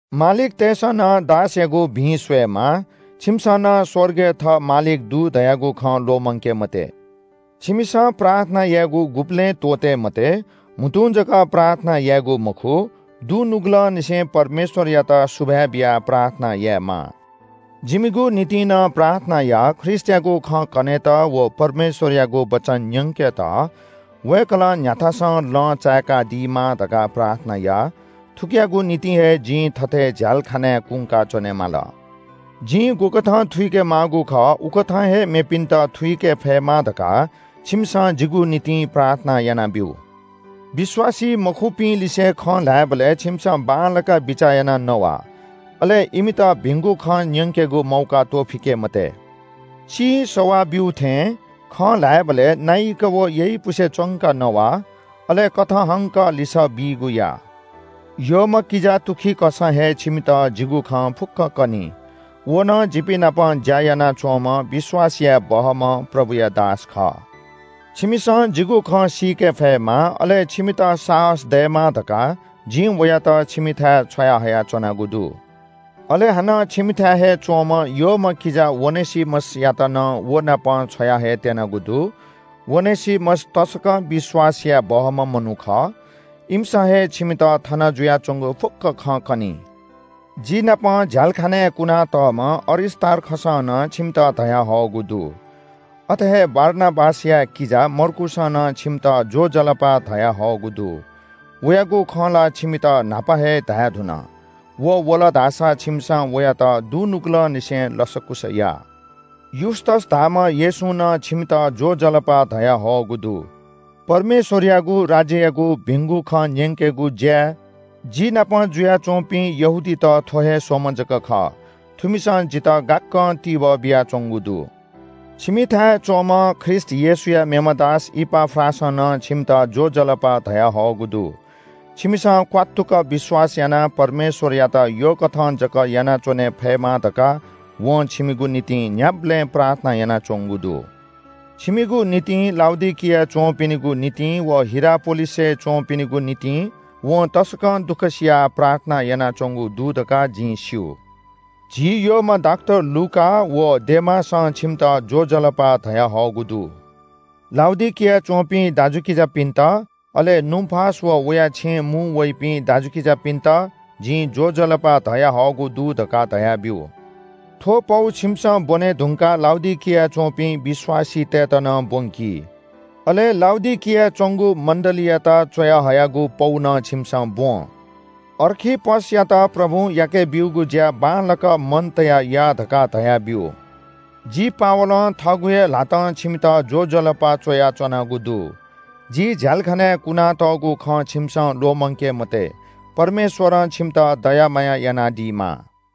मालिकतय्‌सं नं दासयागु भिं स्‍वयेमाः। छिमिसं नं स्‍वर्गय् थः मालिक दु धयागु खँ ल्‍वःमंके मते। छिमिसं प्रार्थना यायेगु गुबलें त्‍वःते मते। म्‍हुतुं जक प्रार्थना यायेगु मखु, दुनुगलंनिसें परमेश्‍वरयात सुभाय् बियाः प्रार्थना यायेमाः। जिमिगु निंतिं नं प्रार्थना या। ख्रीष्‍टयागु खँ कनेत व परमेश्‍वरयागु वचन न्‍यंकेत वय्‌कलं न्‍ह्याथासं लँ चायेकादीमा धकाः प्रार्थना या। थुकियागु निंतिं हे जिं थथे झ्‍यालखानाय् कुंका च्‍वनेमाल। जिं गुकथं थुइके माःगु खः उकथं हे मेपिन्‍त थुइके फयेमा धकाः छिमिसं जिगु निंतिं प्रार्थना यानाब्‍यु। विश्‍वासी मखुपिंलिसे खँ ल्‍हायेबलय् छिमिसं बांलाक बिचाः यानाः नवा। अले इमित भिंगु खँ न्‍यंकेगु मौका त्‍वःफिके मते। चिं सवा ब्‍यू थें खँ ल्‍हायेबलय् नाइक व यइपुसे च्‍वंक नवा। अले कथंहंक लिसः बीगु या। यःम्‍ह किजा तुखिकसं हे छिमित जिगु खँ फुक्‍क कनी। व नं जिपिं नाप ज्‍या यानाच्‍वंम्‍ह विश्‍वास याये बहःम्‍ह प्रभुया दास खः। छिमिसं जिगु खँ सीके फयेमा, अले छिमित साहस दयेमा धकाः जिं वयात छिमिथाय् छ्वया हयाच्‍वनागु दु। अले हानं छिमिथाय् हे च्‍वंम्‍ह यःम्‍ह किजा ओनेसिमसयात नं व नाप छ्वया हयेत्‍यनागु दु। ओनेसिमस तसकं विश्‍वास याये बहःम्‍ह मनू खः। इमिसं हे छिमित थन जुयाच्‍वंगु फुक्‍क खँ कनी। जिनापं झ्‍यालाखानाय् कुनातःम्‍ह अरिस्‍तार्खसं नं छिमित ज्‍वजलपा धयाहःगु दु। अथे हे बारनाबासया किजा मर्कूसं नं छिमित ज्‍वजलपा धयाहःगु दु। वयागु खँ ला छिमित न्‍हापा हे धायेधुन। व वल धाःसा छिमिसं वयात दुनुगलंनिसें लसकुस या। युस्‍तस धाःम्‍ह येशूं नं छिमित ज्‍वजलपा धयाहःगु दु। परमेश्‍वरयागु राज्‍ययागु भिंगु खँ न्‍यंकेगु ज्‍याय् जि नाप जुयाच्‍वंपिं यहूदीत थ्‍व हे स्‍वम्‍ह जक खः। थुमिसं जितः यक्‍व तिबः बियाच्‍वंगु दु। छिमिथाय् हे च्‍वंम्‍ह ख्रीष्‍ट येशूया मेम्‍ह दास इपाफ्रासं नं छिमित ज्‍वजलपा धयाहःगु दु। छिमिसं क्‍वात्तुक विश्‍वास यानाः परमेश्‍वरयात यःकथं जक यानाच्‍वने फयेमा धकाः वं छिमिगु निंतिं न्‍ह्याबलें प्रार्थना यानाच्‍वंगु दु। छिमिगु निंतिं, लाउडिकियाय् च्‍वंपिनिगु निंतिं व हिरापोलिसय् च्‍वंपिनिगु निंतिं वं तसकं दुःख सियाः प्रार्थना यानाच्‍वंगु दु धकाः जिं स्‍यू। झी यःम्‍ह डाक्‍टर लूका व डेमासं छिमित ज्‍वजलपा धयाहःगु दु। लाउडिकियाय् च्‍वंपिं दाजुकिजापिन्‍त, अले नुम्‍फास व वया छेँय् मुं वइपिं दाजुकिजापिन्‍त जिं ज्‍वजलपा धयाहःगु दु धकाः धयाब्‍यु। थ्‍व पौ छिमिसं ब्‍वने धुंकाः लाउडिकियाय् च्‍वंपिं विश्‍वासीतय्‌त नं ब्‍वंकि। अले लाउडिकियाय् च्‍वंगु मण्‍डलीयात च्‍वयाहयागु पौ नं छिमिसं ब्‍वँ। अर्खिप्‍पसयात प्रभुं याकेब्‍यूगु ज्‍या बांलाक मन तयाः या धकाः धयाब्‍यु। जि पावलं थःगु हे ल्‍हातं छिमित ज्‍वजलपा च्‍वयाच्‍वनागु दु। जि झ्‍यालखानाय् लानाच्‍वंगु खँ छिमिसं ल्‍वःमंके मते। परमेश्‍वरं छिमित दया माया यानादीमा।